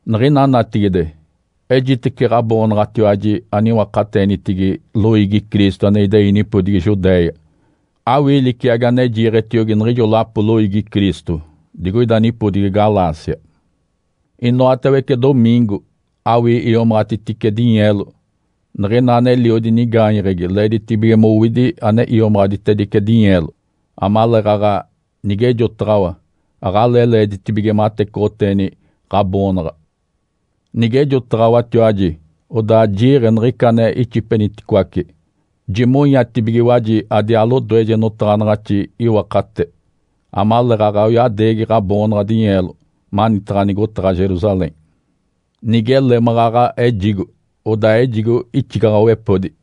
Niɡ̶ina natigide, ejitece ɡ̶aboonaɡ̶atiwaji aniwakateenitigi loiigi Cristo ane idei nipodigi Judéia. Awii liciagi ane jiiɡ̶etiogi niɡ̶ijo lapo loiigi Cristo digoida nipodigi Galácia. Inoatawece domiingo awii iomaɡ̶atitice dinyeelo. Niɡ̶ina aneliodi nigaanyeɡ̶egi leeditibige mowidi ane iomaɡ̶atitedice dinyeelo, amaleeɡ̶aɡ̶a nigejotaɡ̶awa, aɡ̶alee leeditibige matecoɡ̶oteeni ɡ̶aboonaɡ̶a. Nigejotaɡ̶awatiwaji, odaa jiiɡ̶e niɡ̶ica ane ixipeniticoace. Jimonyatibigiwaji adiaa lodoeje notaɡ̶anaɡ̶axi iwakate, amaleeɡ̶aɡ̶a oyadeegi ɡ̶aboonaɡ̶a dinyeelo manitaɡ̶a nigotaɡ̶a Jerusalém. Nigele maɡ̶aɡ̶a ejigo, odaa ejigo ixigaɡ̶awepodi.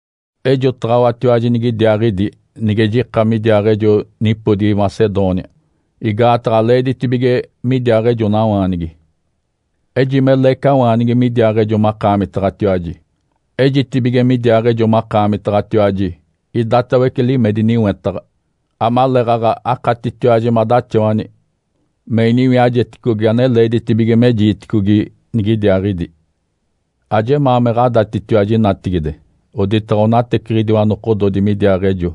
Ejotaɡ̶awatiwaji nigidiaaɡ̶idi nige jika midiaaɡ̶ejo nipodigi Macedônia, igaataɡ̶a leeditibige midiaaɡ̶ejonawaanigi. Ejime leecawaanigi midiaaɡ̶ejo makaamitaɡ̶atiwaji, ejitibige midiaaɡ̶ejo makaamitaɡ̶atiwaji idatawece limedi niwetaɡ̶a, amaleeɡ̶aɡ̶a akatitiwaji madaxawani me iniwiajeticogi ane leeditibige mejiiticogi nigidiaaɡ̶idi. Ajemaa me ɡ̶adatitiwaji natigide oditaɡ̶a onateciɡ̶idiwa nokododi midiaaɡ̶ejo,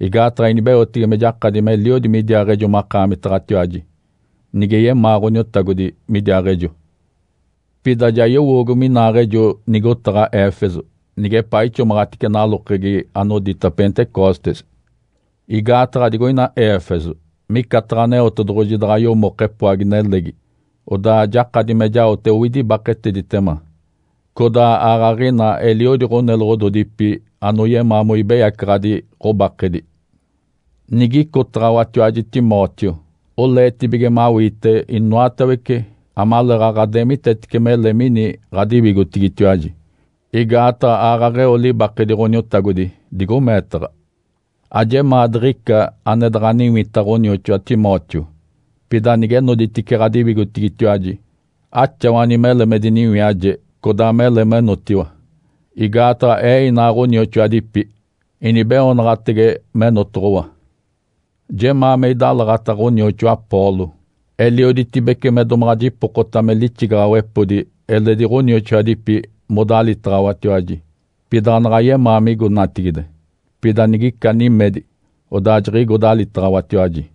igaataɡ̶a inibeotege me jakadi meliodi midiaaɡ̶ejo makaamitaɡ̶atiwaji, nige yemaa Ǥoniotagodi midiaaɡ̶ejo. Pida ja yowoogo minaaɡ̶ejo nigotaɡ̶a Éfeso nigepaa ixomaɡ̶atice nalokegi anodita Pentecostes. Igaataɡ̶a digoina Éfeso micataɡ̶a Aneotedoɡ̶oji daɡ̶a yomoke epoagi-nelegi, odaa jakadi me jaote owidi ibaketeditema. Codaa aaɡ̶aɡ̶ina eliodi ɡ̶oneloɡ̶ododipi anoyemaa moibeyacaɡ̶adi ɡ̶obakedi. Nigicotaɡ̶awatiwaji Timóteo, oleetibige mawiite inoatawece amaleeɡ̶aɡ̶a deemitetece mele mini ɡ̶adiwigotigitiwaji, igaataɡ̶a aaɡ̶aɡ̶a eo libakedi Ǥoniotagodi digo meetaɡ̶a. Ajemaa diɡ̶ica ane daɡ̶a niwita ɡ̶onioxoa Timóteo. Pida nige noditice ɡ̶adiwigotigitiwaji, axawani mele me diniwiaje codaa mele menotiwa. Igaataɡ̶a ee inaa ɡ̶onioxoadipi inibeoonaɡ̶atege menotoɡ̶owa. Jemaa me idalaɡ̶ata ɡ̶onioxoa Apolo. Elioditibece me domaɡ̶a jipokota me lixigaɡ̶awepodi eledi ɡ̶onioxoadipi modalitaɡ̶awatiwaji. Pida anaɡ̶a yemaa migo natigide. Pida nigica nimedi, odaa jiɡ̶igo dalitaɡ̶awatiwaji.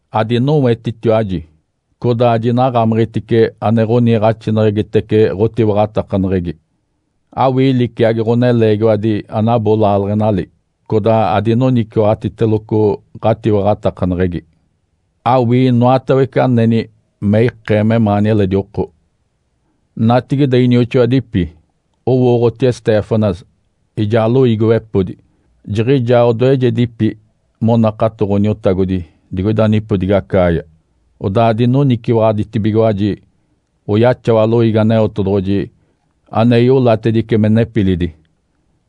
Adinowetitiwaji, codaa jinaɡ̶amiɡ̶itice ane ɡ̶oniiɡ̶axinaɡ̶aneɡ̶egitece ɡ̶otiwaɡ̶atakaneɡ̶egi. Awii liciagi ɡ̶oneleegiwadi anabo laaleɡ̶enali, codaa adinoniciwaɡ̶atiteloco ɡ̶atiwaɡ̶atakaneɡ̶egi. Awii inoatawece aneni me ikee memaani eledi oko. Natigide, inioxoadipi, owooɡ̶oti Estéfanas ijaa loiigiwepodi. Jiɡ̶ijaa odoejedipi monakato Ǥoniotagodi digoida nipodigi Acaia, odaa dinoniciwaɡ̶aditibigiwaji oyaxawa loiigi Aneotedoɡ̶oji ane iolatedice me nepilidi.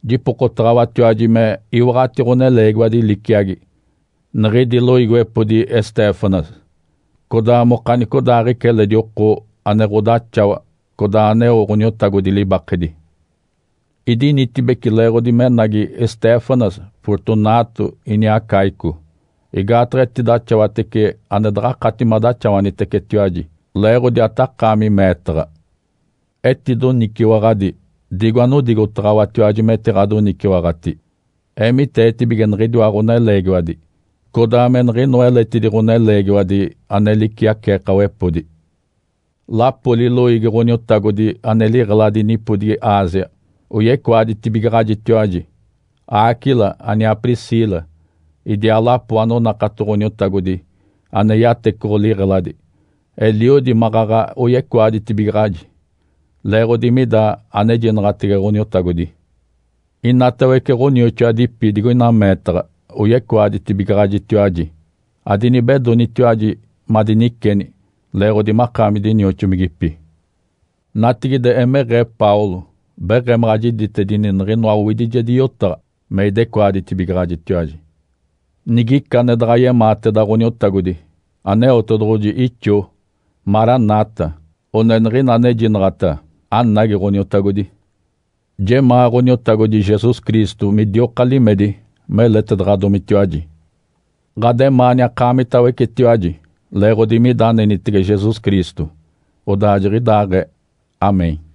Jipokotaɡ̶awatiwaji me iwaɡ̶ati ɡ̶oneleegiwadi liciagi niɡ̶idi loiigiwepodi Estéfanas, codaa mokanicodaaɡ̶ica eledi oko ane ɡ̶odaxawa codaa aneo Ǥoniotagodi libakedi. Idinitibeci leeɡ̶odi menagi Estéfanas, Fortunato, iniaa Acaico, igaataɡ̶a etidaxawatece ane daɡ̶akati madaxawanitecetiwaji leeɡ̶odi atakaami meetaɡ̶a. Etidoniciwaɡ̶adi digo anodigotaɡ̶awatiwaji metiɡ̶adoniciwaɡ̶ati. Eemiteetibige niɡ̶idiwa ɡ̶oneleegiwadi codaa me niɡ̶inoa eletidi ɡ̶oneleegiwadi ane liciaceekawepodi. Lapoli loiigi Ǥoniotagodi ane liɡ̶eladi nipodigi Ásia oyecoaditibigaɡ̶ajitiwaji. Áquila aniaa Priscila idiaa lapo anonakato Ǥoniotagodi ane yatecoɡ̶o liɡ̶eladi, eliodi maɡ̶aɡ̶a oyecoaditibigaɡ̶aji, leeɡ̶odi mida anejinaɡ̶atege Ǥoniotagodi. Inatawece ɡ̶onioxoadipi digoina meetaɡ̶a oyecoaditibigaɡ̶ajitiwaji. Adinibedonitiwaji madiniceni leeɡ̶odi makaami dinioxomigipi. Natigide, emeɡ̶ee, Paulo, beɡ̶emaɡ̶a jiditedini niɡ̶inoa owidijedi yotaɡ̶a me idecoaditibigaɡ̶ajitiwaji. Nigica ane daɡ̶a yemaateda Ǥoniotagodi, Aneotedoɡ̶oji ixoo. “Marana tá!” one niɡ̶ina anejinaɡ̶ata, “Anagi, Ǥoniotagodi!” Jemaa Ǥoniotagodi Jesus Cristo midioka limedi meletedaɡ̶adomitiwaji. Ǥademaani akaamitawecetiwaji leeɡ̶odi mida anenitege Jesus Cristo. Odaa jiɡ̶idaaɡ̶ee. (Amém).